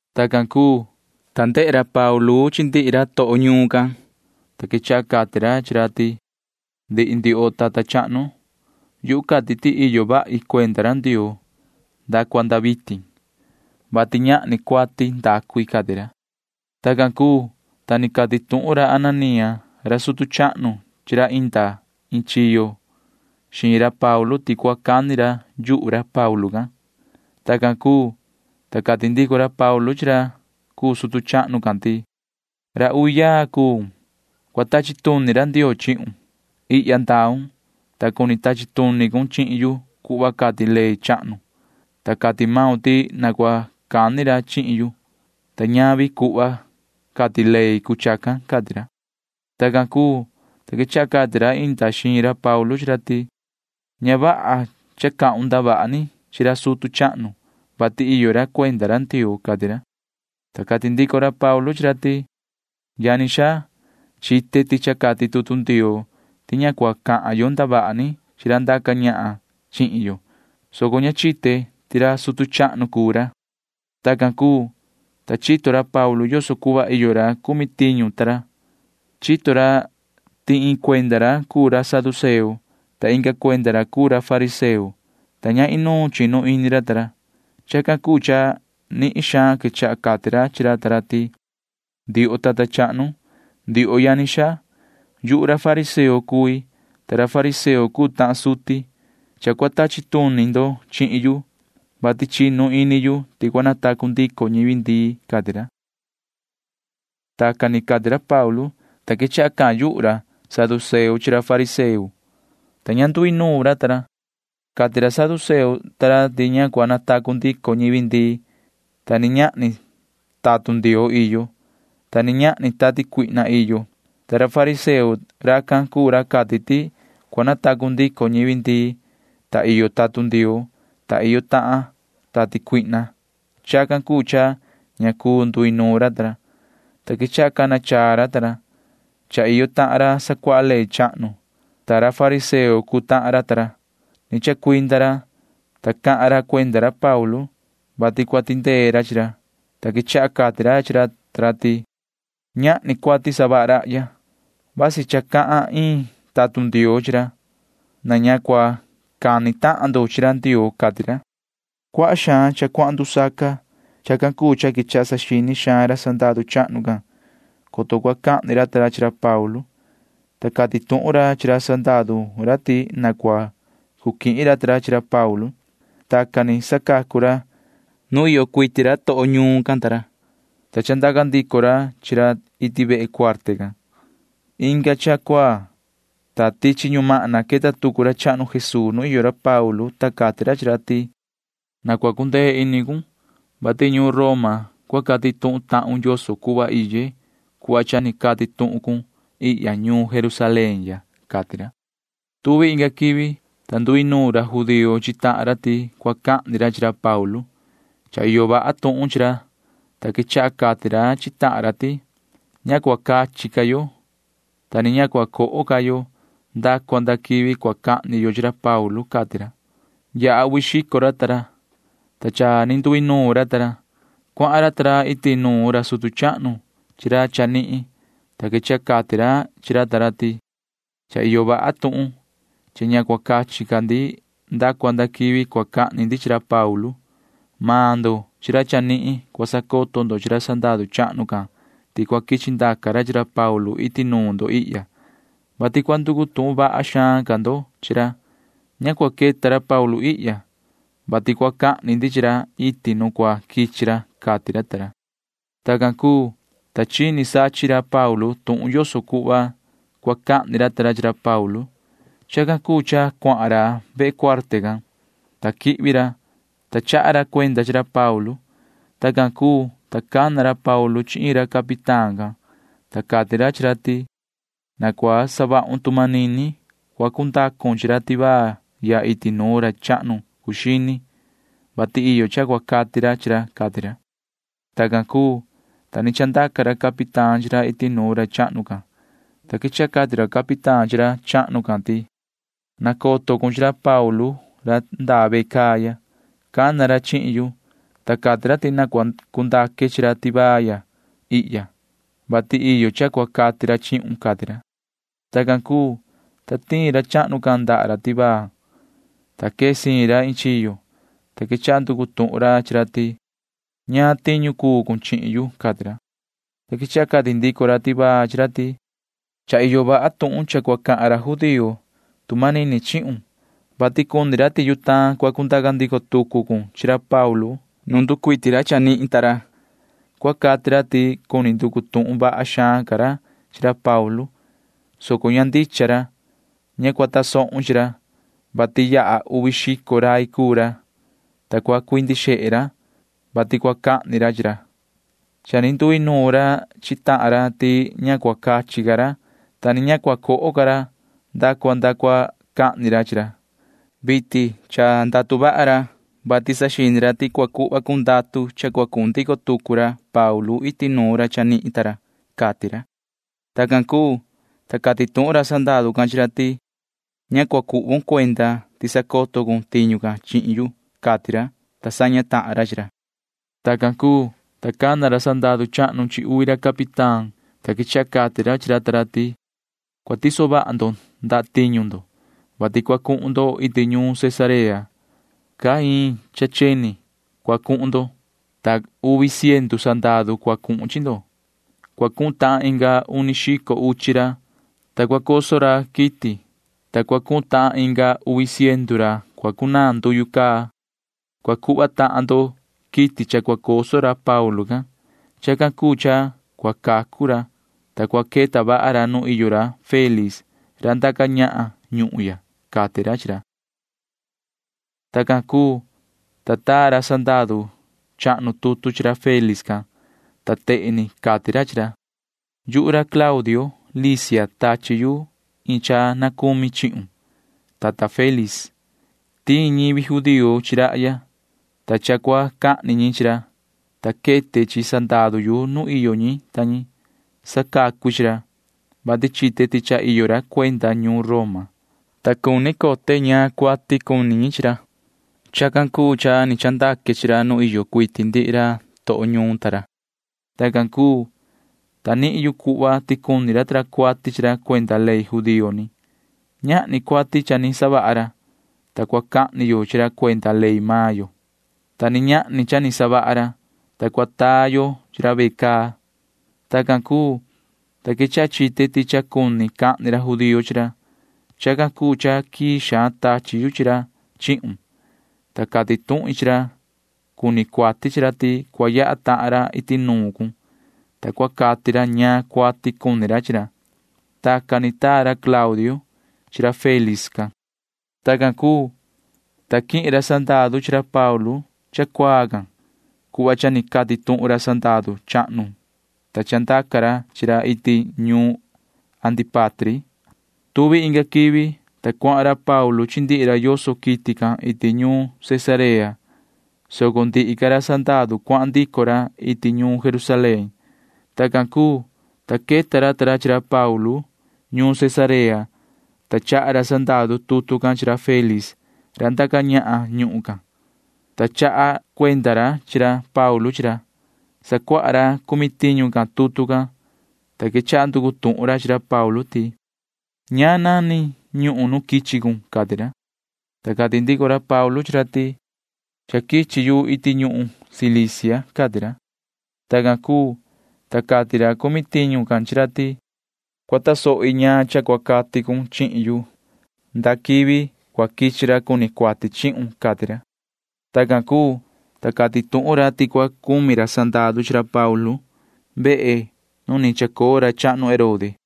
Tacan cuu, ta ndehe ra Paulu chi ndihi ra toho ñuun can, ta quechaha cati ra chi ra ti: ―Ndihi ndioho tata chahnu, yuhu cati ti iyo vahi cuenda ra Ndioo nda cua nda vitin, vati ñahni cuati ndacu i ―cati ra. Tacan cuu, ta ni cati tuhun ra Ananía ra sutu chahnu chi ra inda iin chiyo xiin ra Paulu ti cua cani ra yuhu ra Paulu can. Tacan cuu, ta cati ndico ra Paulu chi ra cuu ra sutu chahnu can ti: ―Yoho ra uvi yaa cuun. Cua tachi tuni ra Ndioo chihun. Ihya ndaun, ta cuni tachi tuni cun chihin yu cuhva cati ley chahnu, ta cati maun ti na cua cani ra chihin yu, ta ñavi cuhva cati ley cuu chacan ―cati ra. Tacan cuu, ta quechaha cati ra inda xiin ra Paulu chi ra ti: ―Ña vaha cha cahun ndavaha ni chi ra sutu chahnu, vati iyo ra cuenda ra Ndioo ―cati ra. Ta cati ndico ra Paulu chi ra ta ra ti: ―Yani xaa, chite ti cha cati tutu Ndioo ti ña cua cahan yo ndavaha ni chi ra ndaca ñahan chihin yo, soco ña chite ti ra sutu chahnu cuu ra. Tacan cuu, ta chito ra Paulu yoso cuhva iyo ra cumi tiñu ta ra. Chito ra ti iin cuenda ra cuu ra saduceo, ta inga cuenda ra cuu ra fariseo, ta ña inuun chinu ini ra ta ra. Chacan cuu cha nihin xaan quechaha cati ra chi ra ta ra ti: ―Ndioho tata chahnu, ndioho yani xaa, yuhu ra fariseo cui, ta ra fariseo cuu tahan suti. Cha cua tachi tuni ndo chihin yu, vati chinu ini yu ti cua natacu ndico ñivi ndii ―cati ra. Tacan ni cati ra Paulu, ta quechaha cahan yuhu ra saduceo chi ra fariseo, ta ña nduinuun ra ta ra. Cati ra saduceo ta ra ti ña cua natacu ndico ñivi ndii, ta ni ñahni tatun Ndioo iyo, ta ni ñahni tati cuihna iyo. Ta ra fariseo―racan cuu ra cati ti cua natacu ndico ñivi ndii, ta iyo tatun Ndioo, ta iyo tahan tati cuihna. Chacan cuu cha ña cuu nduinuun ra ta ra, ta quechaha cana chaa ra ta ra. Cha iyo tahan ra sacuaha ley chahnu, ta ra fariseo cuu tahan ra ta ra. Ni chacuinda ra, ta cahan ra cuenda ra Paulu, [vati cua tindee ra chi ra,] ta quechaha cati ra chi ra ta ra ti: ―Ñahni cuati savaha rahya. Vasi cha cahan iin tatun Ndioo chi ra. Na ña cua cani tahan ndo chi ra Ndioo ―cati ra. Cuaha xaan cha cuahan ndusaca. Chacan cuu cha quechaha saxini xaan ra sandaru chahnu can, coto cua cahni ra ta ra chi ra Paulu, ta cati tuhun ra chi ra sandaru ra ti na cua cu quihin ra ta ra chi ra Paulu. Tacan ni sacacu ra chi ra nu iyo cuiti ra toho ñuun ta ra, ta chandaca ndico ra chi ra iti vehe cuarte can. Inga cha cuaa, ta tichi ñumahna queta tucu ra chahnu Jesuu nu iyo ra Paulu, ta cati ra chi ra ti: ―Na cua cundee ini cun, vati ñuun Roma cua cati tuhun tahun yoso cuhva iye cuhva cha ni cati tuhun cun ihya ñuun Jerusalén ya ―cati ra. Tuvi inga quivi, ta nduinuun ra judío chi tahan ra ti cua cahni ra chi ra Paulu. Cha iyo vaha tuhun chi ra, ta quechaha cati ra chi tahan ra ti: ―Ña cua cachi ca yo, ta ni ña cua coho ca yo nda cua nda quivi cua cahni yo chi ra Paulu ―cati ra. Yaha uvi xico ra ta ra, ta cha ni nduinuun ra ta ra. Cuahan ra ta ra iti nuun ra sutu chahnu chi ra chanihin, ta quechaha cati ra chi ra ta ra ti: ―Cha iyo vaha tuhun cha ña cua cachi ca ndi nda cua nda quivi cua cahni ndi chi ra Paulu. Maan ndo chi ra chanihin cua sacoto ndo chi ra sandaru chahnu can ti cua quichi ndaca ra chi ra Paulu iti nuun ndo ihya, vati cua nducu tuhun vaha xaan ca ndo chi ra. Ña cua queta ra Paulu ihya, vati cua cahni ndi chi ra iti nu cua quichi ra ―cati ra ta ra. Tacan cuu, ta chini sachin ra Paulu tuhun yoso cuhva cua cahni ra ta ra chi ra Paulu. Chacan cuu cha cuahan ra vehe cuarte can, ta quihvi ra, ta chaha ra cuenda chi ra Paulu. Tacan cuu, ta cana ra Paulu chi iin ra capitán can, ta cati ra chi ra ti: ―Na cua savahun tu manini cua cundacon chi ra tivaa ya iti nuun ra chahnu cuu xini, vati iyo cha cua cati ra chi ra ―cati ra. Tacan cuu, ta ni chandaca ra capitán chi ra iti nuun ra chahnu can, ta quechaha cati ra capitán chi ra chahnu can ti: ―Nacoto cun chi ra Paulu ra ndaa ve caa ya. Cana ra chihin yu, ta cati ra ti na cua cundaque chi ra tivaa ya ihya, vati iyo cha cua cati ra chihun ―cati ra. Tacan cuu, ta tiin ra chahnu can ndaha ra tivaa, ta quee siin ra iin chiyo, ta quechaha nducu tuhun ra chi ra ti: ―¿Ñaan tiñu cuu cun chihin yu? ―cati ra. Ta quechaha cati ndico ra tivaa chi ra ti: ―Cha iyo vaha tuhun cha cua cahan ra judío tu manini chihun, vati cuni ra ti yutaan cua cundaca ndico tucu cun chi ra Paulu nu nducuiti ra chanihin ta ra. Cua cati ra ti cuni nducu tuhun vaha xaan ca ra chi ra Paulu, soco ña ndicha ra. Ña cua tasohun chi ra, vati yaha uvi xico rai cuu ra, ta cua cuindi xehe ra, vati cua cahni ra chi ra. Cha ni nduinuun ra chi tahan ra ti ña cua cachi ca ra, ta ni ña cua coho ca ra nda cua nda cua cahni ra chi ra. Vitin cha ndatu vaha ra, vati saxini ra ti cua cuhva cun ndatu cha cua cuhun ndico tucu ra Paulu iti nuun ra chanihin ta ra ―cati ra. Tacan cuu, ta cati tuhun ra sandaru can chi ra ti: ―Ña cua cuhvon cuenda ti cha sacoto cun tiñu can chihin yu ―cati ra, ta saña tahan ra chi ra. Tacan cuu, ta cana ra sandaru chahnu chi uvi ra capitán, ta quechaha cati ra chi ra ta ra ti: ―Cua tiso vaha ndo ndatiñu ndo, vati cua cuhun ndo iti ñuun Cesarea. Caa iin cha cheni cua cuhun ndo, ta uvi ciendu sandaru cua cuhun chi ndo. Cua cuhun tahan inga uni xico uchi ra, ta cua coso ra quiti, ta cua cuhun tahan inga uvi ciendu ra cua cunaan nduyu. Cua cuhva tahan ndo quiti cha cua coso ra Paulu can. Chacan cuu cha cua cacu ra, ta cua queta vaha ra nu iyo ra Félix ra ndaca ñahan ñuhun ya ―cati ra chi ra. Tacan cuu, ta taa ra sandaru chahnu tutu chi ra Félix can, ta tehen ni cati ra chi ra: “Yuhu ra Claudio Lisia tachi yu iin tuhun na cumi chihun, yoho tata Félix. Tiin ñivi judío chi rahya, ta cha cua cahni ñi chi ra, ta quete chi sandaru yu nu iyo ñi ta ñi. Sacacu i chi ra, vati chite ti cha iyo ra cuenda ñuun Roma, ta cuni cote ñaan cuati cuni ñi chi ra. Chacan cuu cha ni chandaque chi ra nu iyo cuiti ndihi ra toho ñuun ta ra. Tacan cuu, ta nihin yu cuhva ti cuni ra ta ra cuati chi ra cuenda ley judío ni. Ñahni cuati cha ni savaha ra, ta cua cahni yo chi ra cuenda ley maan yo, ta ni ñahni cha ni savaha ra, ta cua taa yo chi ra ve caa. Tacan cuu, ta quechaha chite ti cha cuni cahni ra judío chi ra. Chacan cuu cha quii xaan tachi yu chi ra chihun, ta cati tuhin chi ra cuni cuati chi ra ti cua yaha tahan ra iti nuun cun, ta cua cati ra ñaan cuati cuni ra chi ra.” Tacan ni taa ra Claudio chi ra Félix can. Tacan cuu, ta quihin ra sandaru chi ra Paulu cha cuaa can cuhva cha ni cati tuhun ra sandaru chahnu, ta chandaca ra chi ra iti ñuun Antípatri. Tuvi inga quivi, ta cuahan ra Paulu chi ndihi ra yoso quiti can iti ñuun Cesarea, soco ndihi ca ra sandaru cuahan ndico ra iti ñuun Jerusalén. Tacan cuu, ta queta ra Paulu ta ra ñuun Cesarea, ta chaha ra sandaru tutu can chi ra Félix ra ndaca ñahan ñuhun can, ta chaha cuenda ra chi ra Paulu chi ra. Sacuaha ra cumi tiñu can tutu can, ta quechaha nducu tuhun ra chi ra Paulu ti: ―¿Ñaan nani ñuhun nu quichi cun? ―cati ra. Ta cati ndico ra Paulu chi ra ti: ―Cha quichi yu iti ñuhun Cilicia ―cati ra. Tacan cuu, ta cati ra cumi tiñu can chi ra ti: ―Cua tasohi ñaan cha cua cati cun chihin yu ndaa quivi cua quichi ra cuni cuati chihun ―cati ra. Tacan cuu, ta cati tuhun ra ti cua cumi ra sandaru chi ra Paulu vehe nu ni chacoo ra chahnu Herode.